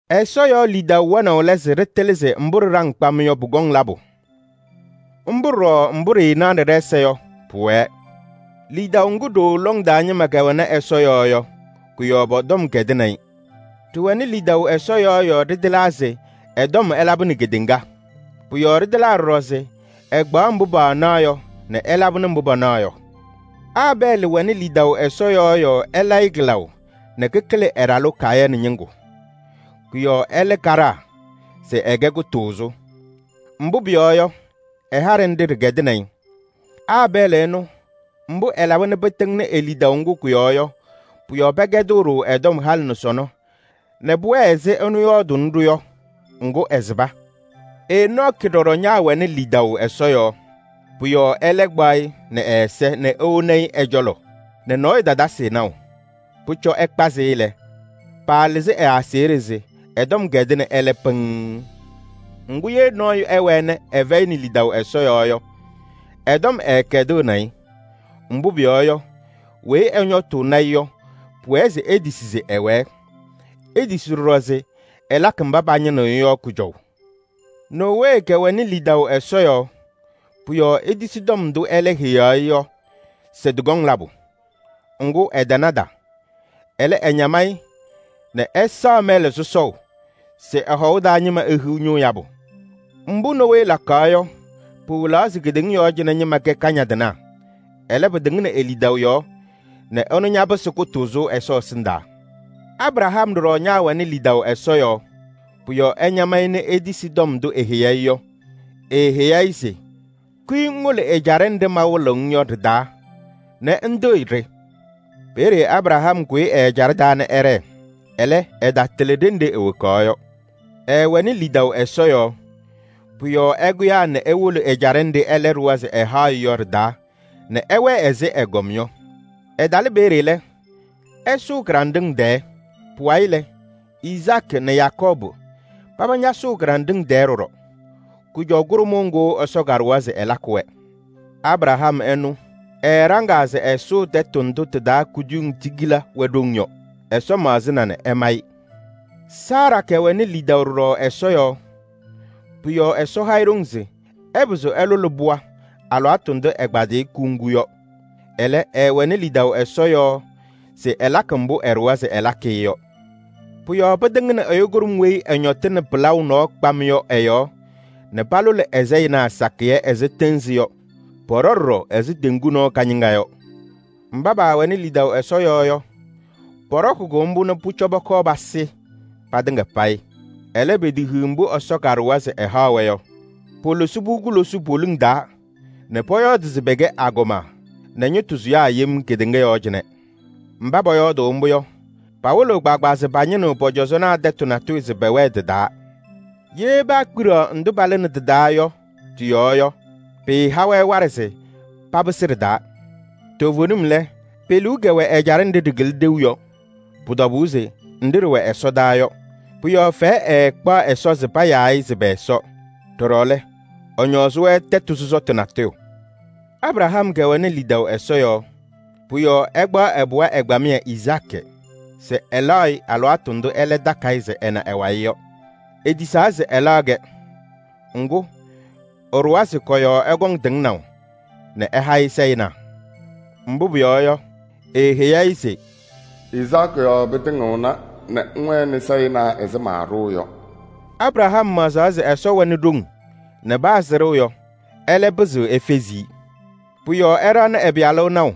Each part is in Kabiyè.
Ɛsɔ yɔɔ lidaʋ wɛnaʋ lɛ se ɖɩtɩlɩ se mbʋ ɖɩɖaŋ kpam yɔ, pʋkɔŋ labʋ. Mbʋ ɖɔɖɔ mbʋ ɖɩɩnaɣnɩ ɖɛ-ɛza yɔ, pʋwɛɛ. Lidaʋ ŋgʋ ɖooo lɔŋ taa ñɩma kɛwɛnɩ Ɛsɔ yɔɔ yɔ, kʋ-yɔɔ pɔ-tɔm kɛdɩnɩ-ɩ. Ɖɩwɛnɩ lidaʋ Ɛsɔ yɔɔ yɔɔ ɖɩtɩlaa se ɛ-tɔm ɛlabɩnɩ kedeŋa. Pʋ-yɔɔ ɖɩtɩlaa ɖɔɖɔ se ɛkpaɣ mbʋ paanaɣ yɔ nɛ ɛlabɩnɩ mbʋ panaɣ yɔ. Aabɛɛlɩ wɛnɩ lidaʋ Ɛsɔ yɔɔ yɔɔ ɛla-ɩ kɩlaʋ nɛ kɩkɩlɩ ɛ-ɖalʋ Kayɩnɩ ñɩŋgʋ. Kʋ-yɔɔ ɛlɛ kaɖaa se ɛkɛ kʋtʋʋzʋ. Mbʋ pʋyɔɔ yɔ, ɛ-haɖɛ nɖɩ ɖɩkɛdɩnɩ-ɩ. Aabɛɛlɩ ɛnʋ, mbʋ ɛlaba nɛ pɩtɩŋnɩ e-lidaʋ ŋgʋ kʋ-yɔɔ yɔ, pʋ-yɔɔ pɛkɛdɩɣ-ɖʋ ɛ-tɔm halɩ nɛ sɔnɔ nɛ pʋwɛɛ ɛzɩ ɛnʋ yɔɔdʋʋnɩnɩ-ɖʋ yɔ. Ŋgʋ ɛsɩba. Enɔɔkɩ ɖɔɖɔ ñaawɛnɩ lidaʋ Ɛsɔ yɔɔ. Pʋ-yɔɔ ɛlɛ kpaɣ-ɩ nɛ ɛ-ɛza nɛ ewoni-i ɛ-cɔlɔ nɛ nɔɔyʋ tatasɩ-ɩ naʋ. Pʋcɔ ɛkpazɩ-ɩ lɛ, paalɩzɩ ɛ-aseɣɖe se ɛ-tɔm kɛdɩnɩ ɛlɛ pɩŋŋ. Ŋgʋ, ye nɔɔyʋ ɛwɛɛ nɛ ɛfɛyɩnɩ lidaʋ Ɛsɔ yɔɔ yɔ, ɛ-tɔm ɛɛkɛdɩɣnɩ-ɩ. Mbʋ pʋyɔɔ yɔ, weyi ɛñɔtʋʋnɩ-ɩ yɔ, pʋwɛɛ se etisi se ɛwɛɛ. Etisi ɖɔɖɔ se ɛlakɩ mba pañɩnɩɣ-ɩ yɔ kʋjɔʋ. Nowee kɛwɛnɩ lidaʋ Ɛsɔ yɔɔ, pʋ-yɔɔ etisi tɔm ndʋ ɛlɛ heyaɣ-i yɔ se tɩkɔŋ labʋ. Ŋgʋ, ɛtanada. Ɛlɛ, ɛñam-ɩ nɛ ɛsaɣ mɛlɛ sɔsɔʋ se ɛ-hɔʋ taa ñɩma ehiɣ ñʋʋ yabʋ. Mbʋ Nowee lakaɣ yɔ, pɩwɩlaɣ se kedeŋa yɔɔ cɩnɛ ñɩma kɛ kañadɩnaa. Ɛlɛ, pɩtɩŋnɩ e-lidaʋ yɔɔ nɛ ɛnʋ ñapɩsɩ kʋtʋʋzʋ Ɛsɔ ɛsɩndaa. Abraham ɖɔɖɔ ñaawɛnɩ lidaʋ Ɛsɔ yɔɔ, pʋ-yɔɔ ɛñam-ɩ nɛ etisi tɔm ndʋ eheyi-i yɔ. Eeheyi-i se: “Kʋyɩ ŋwolo ɛjaɖɛ nɖɩ mawɩlɩɣ-ŋ yɔ ɖɩ-taa nɛ ŋtɩɣyɩ-ɖɩ.” Peeye Abraham kʋyɩ ɛ-ɛjaɖɛ taa nɛ ɛɖɛɛ. Ɛlɛ, ɛtatɩlɩ ɖenɖe ewokaɣ yɔ. Ɛɛwɛnɩ lidaʋ Ɛsɔ yɔɔ, pʋ-yɔɔ ɛkʋyaa nɛ ewolo ɛjaɖɛ nɖɩ ɛlɛ ɖʋwa se ɛhaɣ-ɩ yɔ ɖɩ-taa nɛ ɛwɛɛ ɛzɩ ɛgɔm yɔ. Ɛtalɩ peeye lɛ, ɛsʋʋ kɩɖanɖɩŋ tɛɛ. Pʋwayɩ lɛ, Izaakɩ nɛ Yakɔɔbʋ paba ñasʋʋ kɩɖanɖɩŋ tɛɛ ɖɔɖɔ: kʋjɔʋ kʋɖʋmʋʋ ŋgʋ Ɛsɔ kaɖʋwa se ɛlakɩ-wɛ. Abraham ɛnʋ, ɛɛɖaŋaa se ɛsʋʋ tɛtʋ ndʋ tɩ-taa kuduyiŋ tigila wɛ ɖoŋ yɔ. Ɛsɔ maɣzɩna nɛ ɛma-ɩ. Saara kɛwɛnɩ lidaʋ ɖɔɖɔ Ɛsɔ yɔɔ, pʋ-yɔɔ Ɛsɔ ha-ɩ ɖoŋ se ɛpɩzɩ ɛlʋlɩ pɩɣa alɩwaatʋ ndʋ ɛkpadayɩ kuŋgu yɔ. Ɛlɛ, ɛɛwɛnɩ lidaʋ Ɛsɔ yɔɔ se ɛlakɩ mbʋ ɛɖʋwa se ɛlakɩ-ɩ yɔ. Pʋ-yɔɔ pɩtɩŋnɩ ɛyʋ kʋɖʋm weyi ɛñɔtɩnɩ pɩlaʋ nɔɔ kpam yɔ ɛ-yɔɔ nɛ palʋlɩ ɛ-sayɩnaa sakɩyɛ ɛzɩ tɩɩnzɩ yɔ. Pɔɖɔ ɖɔɖɔ ɛzɩ teŋgu nɔɔ kañɩŋa yɔ. Mba paawɛnɩ lidaʋ Ɛsɔ yɔɔ yɔ, pɔɖɔkɩ-kʋ mbʋ nɛ pʋcɔ pɔkɔɔ pasɩ patɩŋa payɩ. Ɛlɛ, petehiɣ mbʋ Ɛsɔ kaɖʋwa se ɛhaɣ-wɛ yɔ. Polosi-pʋ kulosuu poliŋ taa nɛ pɔyɔɔdɩ se pɛkɛ agɔma nɛ ñɩtʋ sʋyaa yem kedeŋa yɔɔ cɩnɛ. Mba pɔyɔɔdʋʋ mbʋ yɔ, pawɩlɩɣ kpaagbaa se pañɩnɩɣ pɔ-cɔzɔnaa tɛtʋ natʋyʋ se pɛwɛɛ tɩ-taa. Ye paakpiɖaɣ ndʋ palɩnɩ tɩ-taa yɔ tɩ-yɔɔ yɔ, pɩɩha-wɛ waɖɛ se papɩsɩ ɖɩ-taa. Toovenim lɛ, pe-liu kɛwɛ ɛjaɖɛ nɖɩ ɖɩkɩlɩ ɖeu yɔ. Pʋ-tɔbʋʋ se nɖɩ ɖɩwɛ ɛsɔdaa yɔ. Pʋ-yɔɔ fɛyɛ ɛɛkpaɣ Ɛsɔ se payaa-ɩ se pɛ-Ɛsɔ. Ɖɔɖɔ lɛ, ɛñɔɔzɩ-wɛ tɛtʋ sɔsɔtʋ natʋyʋ. Abraham kɛwɛnɩ lidaʋ Ɛsɔ yɔɔ, pʋ-yɔɔ ɛkpaɣ ɛ-pɩɣa ɛgbamɩyɛ Izaakɩ se ɛlaɣ-ɩ alɩwaatʋ ndʋ ɛlɛ takɩ-ɩ se ɛna ɛ-wayɩ yɔ. Etisaa se ɛlaɣ-kɛ. Ŋgʋ, ɛɖʋwa se kɔ-yɔɔ ɛkɔŋ tɩŋnaʋ nɛ ɛha-ɩ sayɩnaa. Mbʋ pʋyɔɔ yɔ, eeheyi-i se: “Izaakɩ yɔɔ pɩtɩŋɩɣna nɛ ŋwɛnɩ sayɩnaa ɛzɩ maaɖʋʋ yɔ.” Abraham maɣzaɣ se Ɛsɔ wɛnɩ ɖoŋ nɛ paa sɩɖʋ yɔ, ɛlɛ pɩzɩɣ efezi-i. Pʋ-yɔɔ ɛɖaɣnɩ ɛ-pɩyalʋ naʋ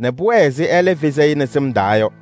nɛ pʋwɛɛ ɛzɩ ɛlɛ fezi-i nɛ sɩm yɔɔ yɔ.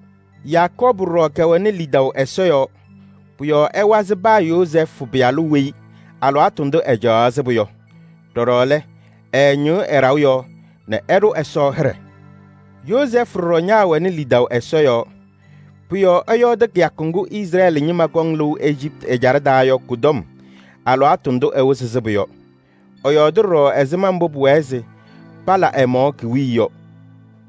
Yakɔɔbʋ ɖɔɖɔ kɛwɛnɩ lidaʋ Ɛsɔ yɔɔ, pʋ-yɔɔ ɛwazɩ paa Yozɛɛfʋ pɩyalʋ weyi ɛ-yɔɔ alɩwaatʋ ndʋ ɛcaɣaɣ sɩbʋ yɔ. Ɖɔɖɔ lɛ, ɛɛñɩɣ ɛ-ɖaʋ nɔɔ taa nɛ ɛɖʋ Ɛsɔ hɩɖɛ. Yozɛɛfʋ ɖɔɖɔ ñaawɛnɩ lidaʋ Ɛsɔ yɔɔ. Pʋ-yɔɔ ɛyɔɔdɩ kɩyakʋ ŋgʋ Izrɛɛlɩ ñɩma kɔŋ lɩʋ Ejiptɩ ɛjaɖɛ taa yɔ kʋ-tɔm alɩwaatʋ ndʋ ɛwɩzɩ sɩbʋ yɔ. Ɛyɔɔɖɩ ɖɔɖɔ ɛzɩma mbʋ pʋwɛɛ se pala ɛ-mɔɔ ki-wiye yɔ.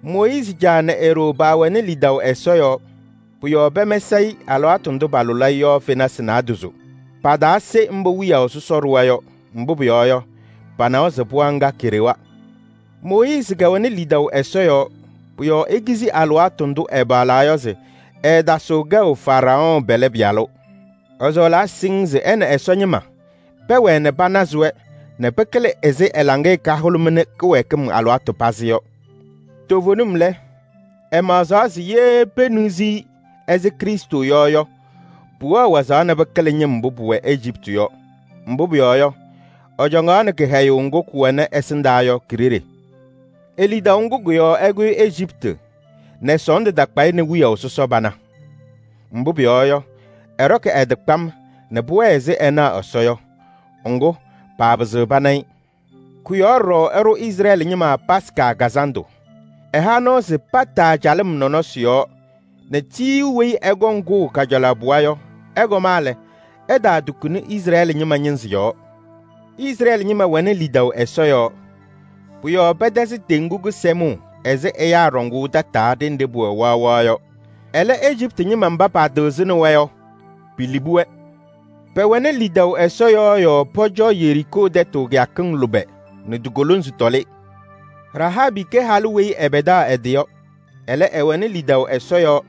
Mooyiizi caa nɛ e-ɖoo paawɛnɩ lidaʋ Ɛsɔ yɔɔ. Pʋ-yɔɔ pɛmɛsɩ-ɩ alɩwaatʋ ndʋ palʋlɩ-ɩ yɔ fenasɩ naadozo. Pataase mbʋ wiyaʋ sɔsɔ ɖʋwa yɔ, mbʋ pʋyɔɔ yɔ, panawa se pɩɣa ŋga keɖewa. Mooyiizi kɛwɛnɩ lidaʋ Ɛsɔ yɔɔ, pʋ-yɔɔ ekizi alɩwaatʋ ndʋ ɛpaɣlaa yɔ se ɛɛtasɩɣ kɛʋ Faraɔɔ pɛlɛ pɩyalʋ. Ɛsɔɔlaa siŋŋ se ɛ nɛ Ɛsɔ ñɩma pɛwɛɛ nɛ panazɩ-wɛ nɛ pɩkɩlɩ ɛzɩ ɛ-laŋɩyɛ kahʋlʋmɩnɩ kɩwɛɛkɩm alɩwaatʋ pazɩ yɔ. Toovenim lɛ, ɛmaɣzaɣ se ye peniɣzi-i ɛzɩ Krɩstʋ yɔ yɔ, pʋwɛɣ wazaɣ nɛ pɩkɩlɩ ñɩm mbʋ pʋwɛ Ejiptɩ yɔ. Mbʋ pʋyɔɔ yɔ, ɛcɔŋaɣnɩ kɩhɛyʋʋ ŋgʋ kʋwɛnɩ ɛsɩndaa yɔ ki-ɖeɖe. E-lidaʋ ŋgʋ kʋ-yɔɔ ɛkʋyɩ Ejiptɩ nɛ sɔɔndʋ takpa-ɩ nɛ wiyaʋ sɔsɔ pana. Mbʋ pʋyɔɔ yɔ, ɛɖɔkɩ ɛ-tɩ kpam nɛ pʋwɛɛ ɛzɩ ɛnaɣ Ɛsɔ yɔ, ŋgʋ, paapɩzɩɣ pana-ɩ. Kʋ-yɔɔ ɖɔɖɔ ɛɖʋ Izrɛɛlɩ ñɩma Yomiye Taa Lɩʋ Kazandʋ. Ɛha nɔɔ se pataa calɩm nɔnɔsɩ yɔɔ nɛ tiyiyu weyi ɛkɔŋ kʋʋ kajalaɣ piya yɔ, ɛkɔma lɛ, ɛtaatukuni Izrɛɛlɩ ñɩma ñɩnzɩ yɔɔ. Izrɛɛlɩ ñɩma wɛnɩ lidaʋ Ɛsɔ yɔɔ, pʋ-yɔɔ pɛtɛzɩ Teŋgu Kɩsɛmʋʋ ɛzɩ ɛyaa ɖɔŋʋʋ tataa ɖenɖe pʋwɛ waɣwaɣ yɔ. Ɛlɛ, Ejiptɩ ñɩma mba patɩɣzaɣnɩ-wɛ yɔ, pilibi-wɛ. Pɛwɛnɩ lidaʋ Ɛsɔ yɔɔ yɔɔ pɔcɔ Yeriikoo tɛtʋ kɩyakɩŋ lʋbɛ nɛ ti-kolonzi tɔlɩ. Rahaabɩ kɛ halʋ weyi ɛpɛdaɣ ɛ-tɩ yɔ. Ɛlɛ, ɛwɛnɩ lidaʋ Ɛsɔ yɔɔ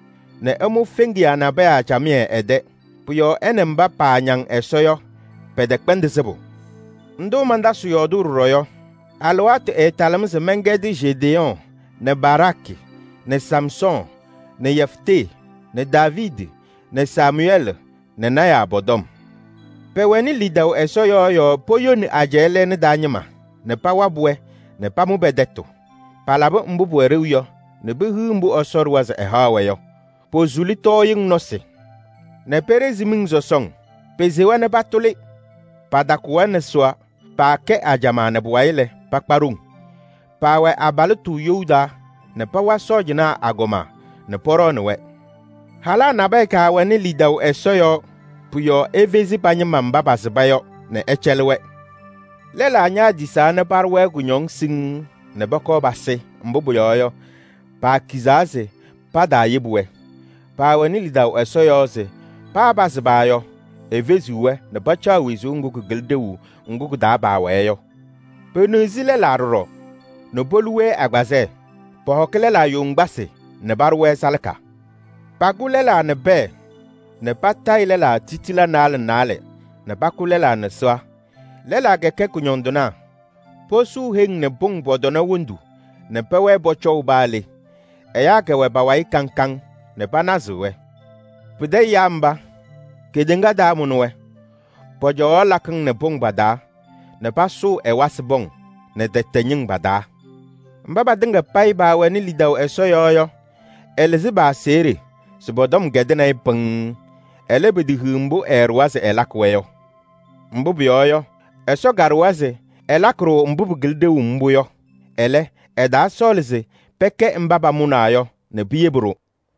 nɛ ɛmʋ feŋiyaa nabɛyɛ camɩyɛ ɛ-tɛ. Pʋ-yɔɔ ɛ nɛ mba paañaŋ Ɛsɔ yɔ pɛtɛkpɛndɩ sɩbʋ. Ndʋ mantasɩɣ yɔɔdʋʋ ɖɔɖɔ yɔ? Alɩwaatʋ ɛɛtalɩɣ-m se mɛnkɛdɩ Jedeyɔɔ nɛ Baraakɩ nɛ Samsɔɔ nɛ Yeftee nɛ Daaviidi nɛ Samʋyɛɛlɩ nɛ lɔɔyɩsɩ tɩnaa pɔ-tɔm. Pɛwɛnɩ lidaʋ Ɛsɔ yɔɔ yɔɔ poyoni ajɛɛ lɛɛna taa ñɩma nɛ pawabɩ-wɛ nɛ pamʋ pɛ-tɛtʋ. Palabɩ mbʋ pʋwɛ ɖeu yɔ nɛ pehiɣ mbʋ Ɛsɔ ɖʋwa se ɛhaɣ-wɛ yɔ. Posuli tɔɔyɩŋ nɔsɩ nɛ peɖezi miŋ sɔsɔŋ. Pesewa nɛ patʋlɩ, patakʋ-wɛ nɛ sɩɣa. Paakɛ ajamaa nɛ pʋwayɩ lɛ, pakpa ɖoŋ. Paawɛ abalɩtʋ you taa nɛ pawa sɔɔjanaa agɔma nɛ pɔɖɔɔnɩ-wɛ. Halaa nabɛyɛ kɛwɛnɩ lidaʋ Ɛsɔ yɔɔ, pʋ-yɔɔ efezi pa-ñɩma mba pasɩba yɔ nɛ ɛcɛlɩ-wɛ. Lɛlaa ñaatisaa nɛ paɖʋ-wɛ kʋñɔŋ siŋŋ nɛ pɔkɔɔ pasɩ, mbʋ pʋyɔɔ yɔ, paakizaa se pataayebi-wɛ. Paawɛnɩ lidaʋ Ɛsɔ yɔɔ se paa pasɩba yɔ, efeziɣ-wɛ nɛ pacaɣ wezuu ŋgʋ kɩkɩlɩ ɖeu ŋgʋ kɩ-taa paawɛɛ yɔ. Peniɣzi lɛlaa ɖɔɖɔ nɛ polu-wɛ agbazɛɛ. Pɔhɔkɩ lɛlaa yoŋgbasɩ nɛ paɖʋ-wɛ salaka. Pakʋ lɛlaa nɛ pɛɛ nɛ patayɩ lɛlaa titilee naalɛ naalɛ nɛ pakʋ lɛlaa nɛ sɩɣa. Lɛlaa kɛkɛ kʋñɔndɩnaa, posuu heŋ nɛ pʋŋ pɔ-tɔna wondu nɛ pɛwɛɛ pɔcɔʋ paa le. Ɛyaa kɛwɛ pa-wayɩ kaŋ kaŋ nɛ panazɩɣ-wɛ. Pɩtɛ ɛyaa mba, kedeŋa taamʋnɩ-wɛ! Pɔcɔwaɣ lakɩŋ nɛ pʋŋ pa-taa nɛ pasʋʋ ɛwasɩ pɔŋ nɛ tɛtɛɛ ñɩŋ pa-taa. Mba patɩŋa payɩ paawɛnɩ lidaʋ Ɛsɔ yɔɔ yɔ, ɛlɩzɩ pa-aseɣɖe se pɔ-tɔm kɛdɩnɩ-ɩ pɩŋŋ. Ɛlɛ, petehiɣ mbʋ ɛɛɖʋwa se ɛlakɩ-wɛ yɔ. Mbʋ pʋyɔɔ yɔ, Ɛsɔ kaɖʋwa se ɛlakɩ-ɖʋ mbʋ pɩkɩlɩ ɖeu mbʋ yɔ. Ɛlɛ, ɛtaasɔɔlɩ se pɛkɛ mba pamʋnaa yɔ nɛ piyebi-ɖʋ.